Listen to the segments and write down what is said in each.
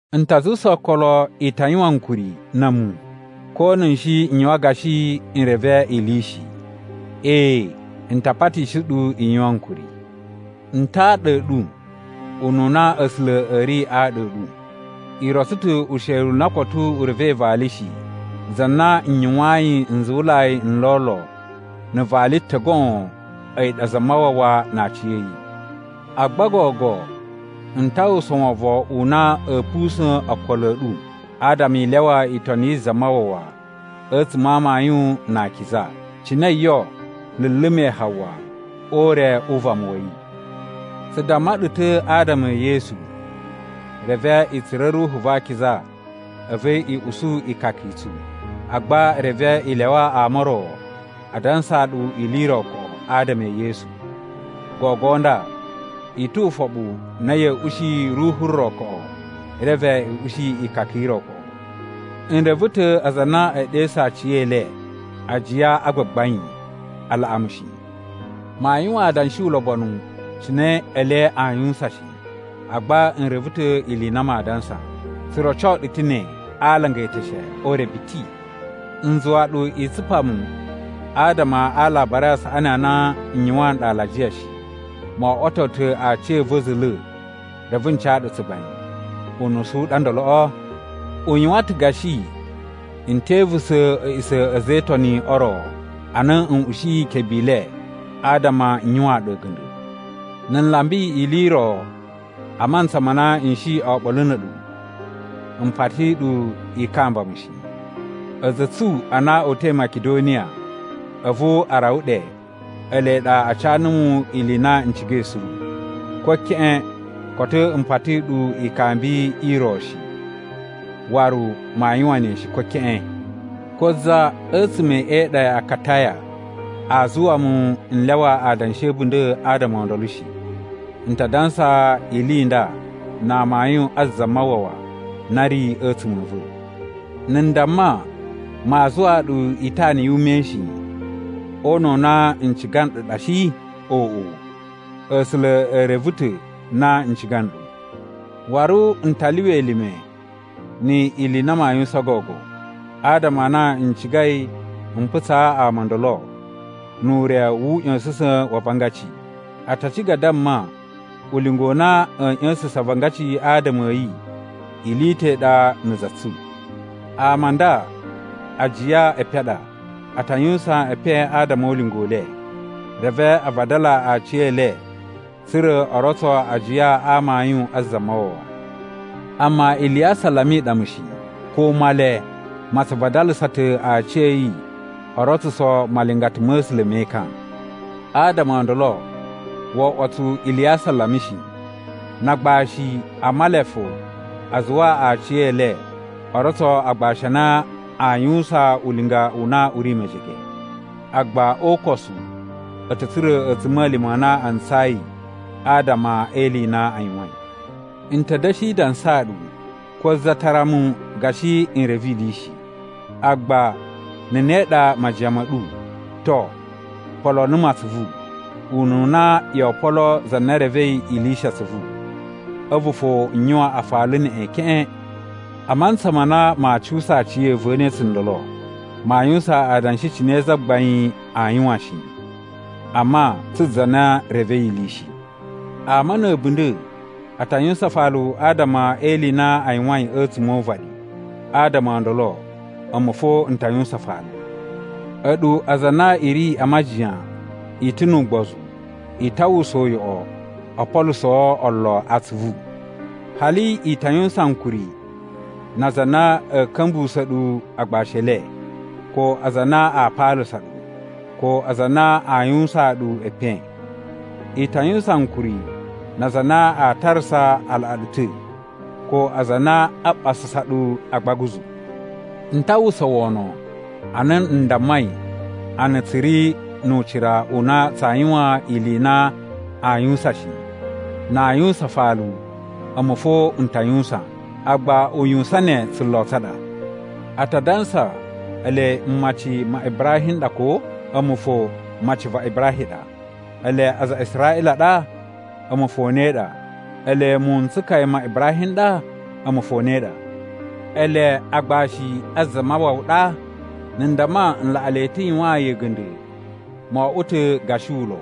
N ta zuwusa okolo i ta yuwan ankuri na̱ a̱mu ko na̱ shi n yuwan gashi n reve ili i shi. Ee, n ta patishi ɗu i yuwan ankuri. N ta aɗa a̱ ɗu ununa A̱sula̱ a̱ ri aɗa a̱ ɗu. I rotso ta̱ usheli u na koto u revei vali shi, za na n yuwayin nzuwulai n lolo na̱ vali ta̱ goon, a̱yi ɗa Zamawawa na aciya̱yi. Agba gogo n ta uwwusa wovon u na a̱a̱ pusa̱n okolo a̱ ɗu adama i lyawa itoni yi Zamawawa a̱tsuma̱ a amayun na akiza, cine yo luluma̱i Hawa o ure u vama wa̱ yi. Tsu damma ɗu ta̱ adama e Yesu, reve i tsura̱ Ruhu va Akiza a̱vu i usu ikaka i tsu. Agba reve i lyawa ama o ro a dansaa ɗu ili i ro koꞌo adama e Yesu. Gogo nda i tu ufoɓu na ya̱a̱ ushi ruhu ro koꞌo reve i ushi ikaka i ro koꞌo. N reve ta̱ aza a na ee ɗesu aciyele “ajiya a gbagbain” a laꞌa mu shi. Maa yuwan adanshi ulobonu cine ele aa yuwusan shi, agba n reve ta̱ ili i na maa dansa. Tsu roco ɗu ta̱ ne a alanga e eteshe o ure biti. N zuwa ɗu i tsupa mu adama a Alabari a Saꞌani a na n yuwaan nɗu alajiya shi. Mo oꞌwoto ta̱ aciya̱va̱ za̱la̱ reve n ca ɗu tsugbain. Unusu u ɗa ndoloꞌo? U yuwan ta̱ gashi n te ivusa̱ a̱ꞌisa̱ a̱ a̱za̱ e Itoni o ro, ana n ushiyi ikebe i le adama n yuwaan ɗu a̱ga̱nda̱. Na̱ n lamba ili i ro a mantsa ma na n shi oɓolo na̱ a̱ɗu, m pati ɗu i kamba mu shi. A̱za̱ a̱ tsu a na o uta̱i Makidoniya a̱vu a rawa ɗe ele ɗa a ca numu ili i na n cigai suru. Ko keꞌen koto m pati ɗu ikambi i ro shi, waru maa yuwan ne shi, ko keꞌen. Ko za a̱tsuma̱ e iɗa ya Akataya aa zuwa mu n lyawa adanshi a̱ a̱bunda̱ adama o ndolo shi. N ta dansa ili i nda na amayun a Zamawawa na ri a̱tsuma̱ a̱ va̱. Na̱ n damma maa zuwaa ɗu itana yu ume shi, o una̱ u na n ciga nɗu ɗa shi? Oꞌo! A̱sula̱ e reve ta̱ na n ciga nɗu. Waru n ta lyuwa elime ni ili i na maa yuwusan gogo, adama a na n cigai m putsa ama o ndolo nu ure wu uꞌya̱sa̱sa̱n wa avangaci. A ta ciga a damma ulinga u na a̱a̱ ꞌya̱sa̱sa̱n avangaci adama a̱ yi, ili i ta̱ i ɗa na̱ za tsu. Ama a nda ajiya e epen a ɗa. A ta yuwusan epen adama o ulinga u le, reve a vadala aciyele tsa̱ra̱ o rotso ajiya a amayun a Zamawawa. Amma ili ya asalama i ɗa mu shi! Ko Male ma tsu vadalasa ta̱ aciya̱yi o rotsuso malingata ma̱ A̱sula̱ me ekan. Adama o ndolo wo oꞌwo tsu ili ya asalama shi, na agbashi a Male fo a zuwa aciyele o rotso agbashi a na aa yuwusan ulinga u na u ri mejege. Agba o ukosu a̱ ta̱ tsura̱ a̱tsuma̱lima̱ a na a ntsayi adama e ili i na a yuwain. N ta̱ da̱shi dansaa ɗu: Ko za tara mu gashi n reve ili shi. Agba na̱ ne ɗa majiyan ma̱ ɗu, to, poloo numu atsuvu, ununa yoo poloo za na revei ili shi atsuvu, a̱vu fo n yuwan afalu neꞌen keꞌen. A mantsa ma na maa cuwusa aciya̱va̱ ne tsundolo, maa yuwusan adanshi cine Zagbain aa yuwan shi, amma tsu za na revei ili shi. Ama na̱ a̱bunda̱ a ta yuwusan afalu adama e ili i na a yuwain a̱tsuma̱ o uvaɗi. Adama o ndolo a̱mu fo n ta yuwusan afalu. A̱ɗu aza a na i ri a majiyan i ta̱ nu ugbozu, i ta uwwusa uyoꞌo o polusoo olo atsuvu! Hali i ta yuwusan ankuri na aza a na a̱a̱ ka̱mbuwusa̱ ɗu agbashi e le, ko aza a na aa paalasa ɗu, ko aza a na aa yuwusaan ɗu epen. I ta yuwusan ankuri na aza a na a tarasa a laꞌa ɗu ta̱, ko aza a na aa ɓasasa ɗu a agbaguzu. N ta uwwusa wono ana n dammai a na tsu ri nu ucira u na tsaa yuwan ili i na aa yuwusan shi. Na aa yuwusan afalu, a̱mu fo n ta yuwusan, agba uyuwusan ne tsulo tsa ɗa. A ta dansa ele mmaci ma Ibrahim n ɗa, ko? A̱mu fo maci va Ibrahim ɗa. Ele aza a Israꞌila a ɗa? A̱mu fo ne ɗa. Ele muwun n tsukaya ma Ibrahim n ɗa? A̱mu fo ne ɗa. Ele agbashi a Zamawawa ɗa? Na̱ n damma n laꞌa le ta̱ yuwaan yi a̱ga̱nda̱ mo oꞌwo ta̱ gashi ulo.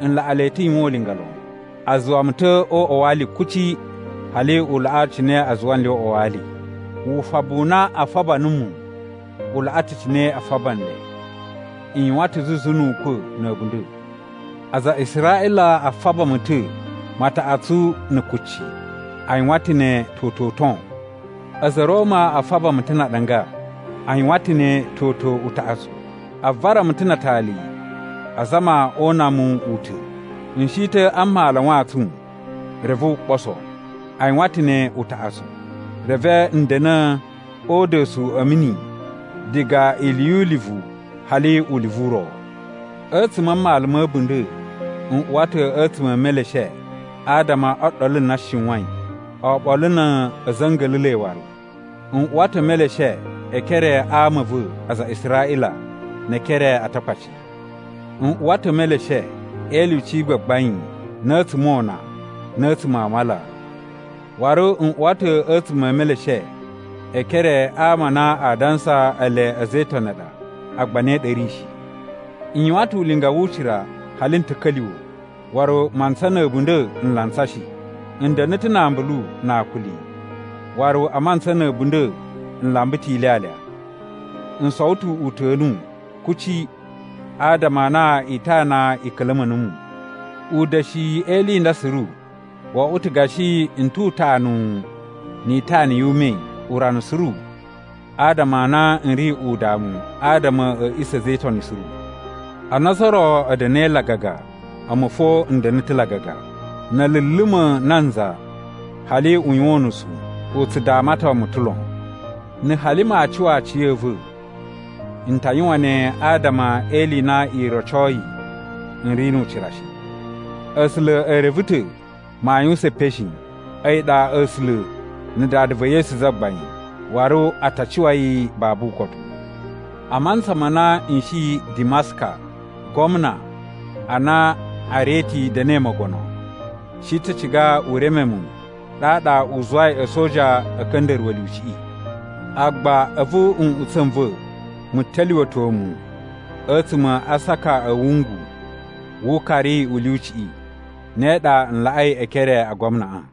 N laꞌa le ta̱ yuwan ulinga lon. A zuwa mu ta̱ o uꞌwa wa ali kuci hali u laꞌa cine a zuwa nle o uꞌwa wa ali. Wufabu u na a faba numu u laꞌa ta̱ cine a faba nle. N yuwan ta̱ zuzu nu ukwa̱ na̱ a̱bunda̱. Aza a Israꞌila a faba mu ta̱ mataꞌatsu na̱ kucci. A yuwan ta̱ ne toto uton. A̱za̱ a̱ Roma a faba mu ta̱ na aɗanga. A yuwan ta̱ ne toto utaꞌatsu. A vara mu ta̱ na atali azama o una mu u ta̱. N shi ta̱ a mmalu a wantsun reve wu ɓoso. A yuwan ta̱ ne utaꞌatsu. Reve n da̱na̱ o uda̱su a̱ mini diga ili yu ulivu hali ulivu u ro. A̱tsuma̱ a mmalu ma̱ a̱bunda̱, n uwa ta̱ a̱tsuma̱ e meleshe adama o ɗolu na shiwain, oɓolo na̱ a̱za̱ a̱ nga̱la̱la̱i waru. N uwa ta̱ e meleshe e ekere a ama a̱ va̱, aza a Israꞌila, ne e ekere a Atakpaci. N uwa ta̱ e meleshe e ilyuci i gbagbain, na̱ a̱tsuma̱ o una, na̱ a̱tsuma̱ a mala. Waru n uwa ta̱ a̱tsuma̱ e meleshe e ekere a ama a na a dansa ele a̱za̱ e Itoni a ɗa, agba ne ɗa a̱ ri shi. N yuwan ta̱ ulinga wu ucira hali n ta̱ka̱lyuwa̱, waru mantsa na̱ a̱bunda̱ n lantsa shi. N da̱na̱ ta̱ na ambulu na akuli, waru a mantsa na̱ a̱bunda̱ n lamba ta̱ ilyalya. N sowo ta̱ uta̱nu kuci adama a na itana i ka̱la̱ma̱ numu. Uda̱shiyi e ili i nda suru, wo oꞌwo ta̱ gashi n tu utanuwu ni itana yu ume urana suru adama a na n ri udamu adama a̱ a̱ꞌisa̱ a̱ a̱za̱ e Itoni suru. Ana ozo o ro a̱ da̱na̱i lagaga, a̱mu fo n da̱na̱ ta̱ lagaga. Na̱ a̱ luluma̱ nanza hali u yuwan unusu u tsu damaton mu ta̱ lon. Na̱ hali maa cuwa aciya̱va̱, n ta yuwan ne adama e ili i na i rocoi n ri nu ucira shi. A̱sula̱ e reve ta̱ maa yuwusan epen shi. A̱yi ɗa A̱sula̱ na̱ Dada va̱ Yesu Zagbain, waru a ta cuwa yi babu ukotu. A mantsa ma na n shi Dimaska, gwamna (ana Areti da̱na̱i mogono) shi ta̱ ciga u reme mu ɗaɗa u zuwai a̱soja a̱ ka̱nda̱ruwa̱ lyuciꞌi. Agba a̱vu nꞌutsa̱ n va̱ mu ta̱lyuwa̱to mu a̱tsuma̱ a aasaka a̱ wungu wu ukari u lyuciꞌi. Ne ɗa n laꞌai e ekere a gwamnaꞌa.